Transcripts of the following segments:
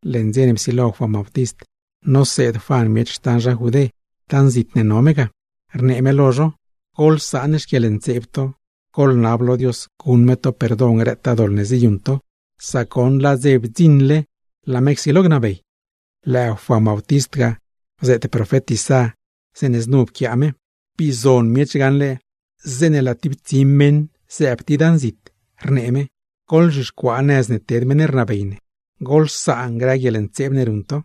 Leṉ dze ne psilo Juan Bautist noseed Juan miech xtan zha Judé, dan zit ne no me ga; rnee me lo zho: ―¡Goḻsaan xquieḻntseeb to, goḻnab lo Dios guṉ me to perdon grëtaa doḻ ne ziyuṉ to; sac goṉ laa dze bdziṉle laa me csilo gnabey! Lëë Juan Bautist ga bzeet profet Isá, zeeṉe znu pquiaa me: Bii zon miech gaṉle zeeṉe laa tib tsi meṉ zëëb tib dan zit, rnee me: “Goḻzhixcuaa nëz ne ted meṉ ne rnabey, goḻsaan grë guieḻntseeb ne ruṉ to.”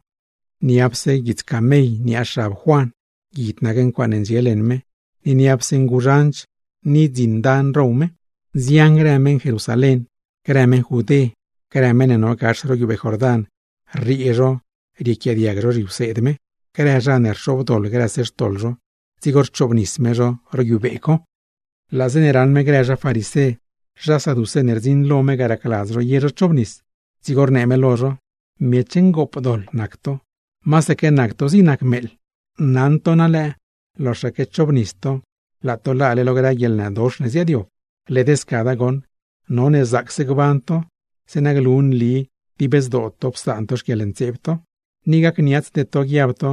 Niapse guits lad camell niaa xab Juan, guid nac ncuaaṉe ndxie leṉ me, ni niapse nguzhanch ni dzin dan row me. Nzian grë meṉguiedz Jerusalén, grë meṉ Judé, grë meṉ ne no gax ro guiubee Jordán, rriee zho riequiaadiag zho zhiwseed me. Grë zha ne rxobdoḻ grëse xtoḻ zho, dzigo rchoobnis me zho ro guiubee co. Laa zeeṉe raṉ me grë zha farisé, zha saducé ne rdziṉ lo me ga racladz zho ye zho chobnis, dzigo rnee me lo zho: ―¡Miech ngoopdoḻ, masaque nac to zig nac meeḻ! Naṉ to na lëë, loxaque chobnis to laa to laale lo grë guieḻnëdox ne ziaadyob. Led scada goṉ, none zaacse gban to zeeṉa glu nli dib zdoo to psaan to grë xquieḻntseeb to. Ni gacniatsde to guiab to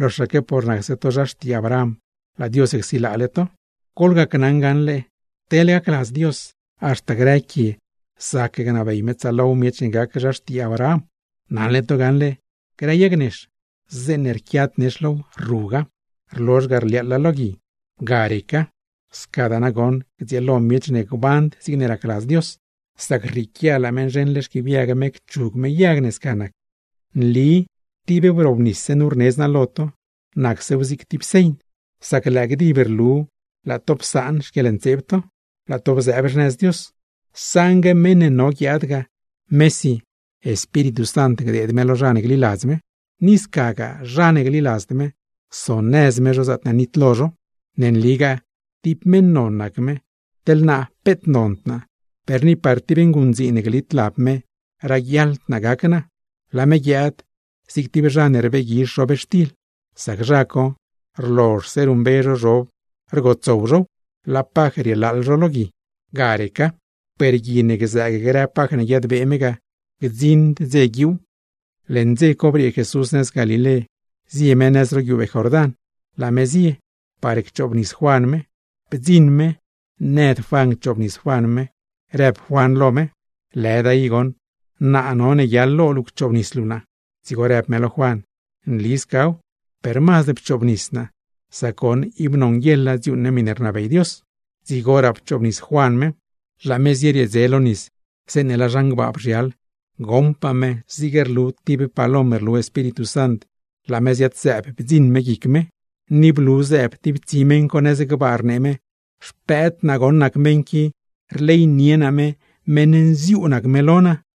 loxaque por nacse to xtii Abraham, laa Dios csilaale to; sac gneli naa lo to gaṉle teḻne gacladz Dios, haxta grë quie zac gnabey me tsaalow miech ne gac zha xtii Abraham. Naṉle to gaṉle, grë yag nex, zeeṉe rquiad nex low led rruga, rlozh ga rliaaḻa lo gui, ga reca. Scadaa nagoṉ gdzieelo miech ne gband zigne racladz Dios, sac rrieequia laa me nzheṉle xquiibyag me cchug me yag ne sca nac. ’Nli tib wrobnisse nu rnedz naa lo to, nacsew zig tib señ, sac lëë gdib rluw laa to psaan xquieḻntseeb to, laa to bzëëb xnëz Dios. Saṉgue meṉ ne no guiaad ga, mesi Espíritu Sant gdeed me lo zha ne gliladz me; ni scagaa zha ne gliladzd me, sonëz me zho zaatne nitlo zho. Ne nligaa tib meṉ non nac me, teḻ naa peet nond naa, per ni par tib nguṉdziin ne glit lab me raguiaḻd naa gac naa. Laa me guiaad zig tib zha ne rbeeguizh zhobxtil, sac zha co rlozhse ruṉmbe zho zhob, rgotsow zhow, laa paj rielaaḻ zho lo gui, ga reca. Per gui ne gzëëg grë paj ne guiadbee me ga, gdziṉd dze guiuuw. Leṉ dze co briee Jesús nëz Galilé zie me nëz ro guiubee Jordán, laa me zie par cchoobnis Juan me. Bdziṉ me nëd Juan cchoobnis Juan me, rëb Juan lo me: ―Lëda i goṉ, naa none guiaḻ lo luu cchoobnis luu naa. Dzigo rëb me lo Juan: ―Nli scaw, per mazd pchoobnis naa, sac goṉ ib nonguieḻa dziuuṉ ne miṉe rnabey Dios. Dzigoraa pchoobnis Juan me. Laa me zieriee lo nis zeeṉe laa zhan gbaa bzhial, goṉpaa me zig rlu tib palom rlu Espíritu Sant laa me ziad-zëëb bdziṉ me guic me, ni blu zëëb tib tsi meṉ co nëz gbaa rnee me: ―Xpëëd naa goṉ nac meṉ qui, rleynie naa me, meṉ nziuu nac me lo naa.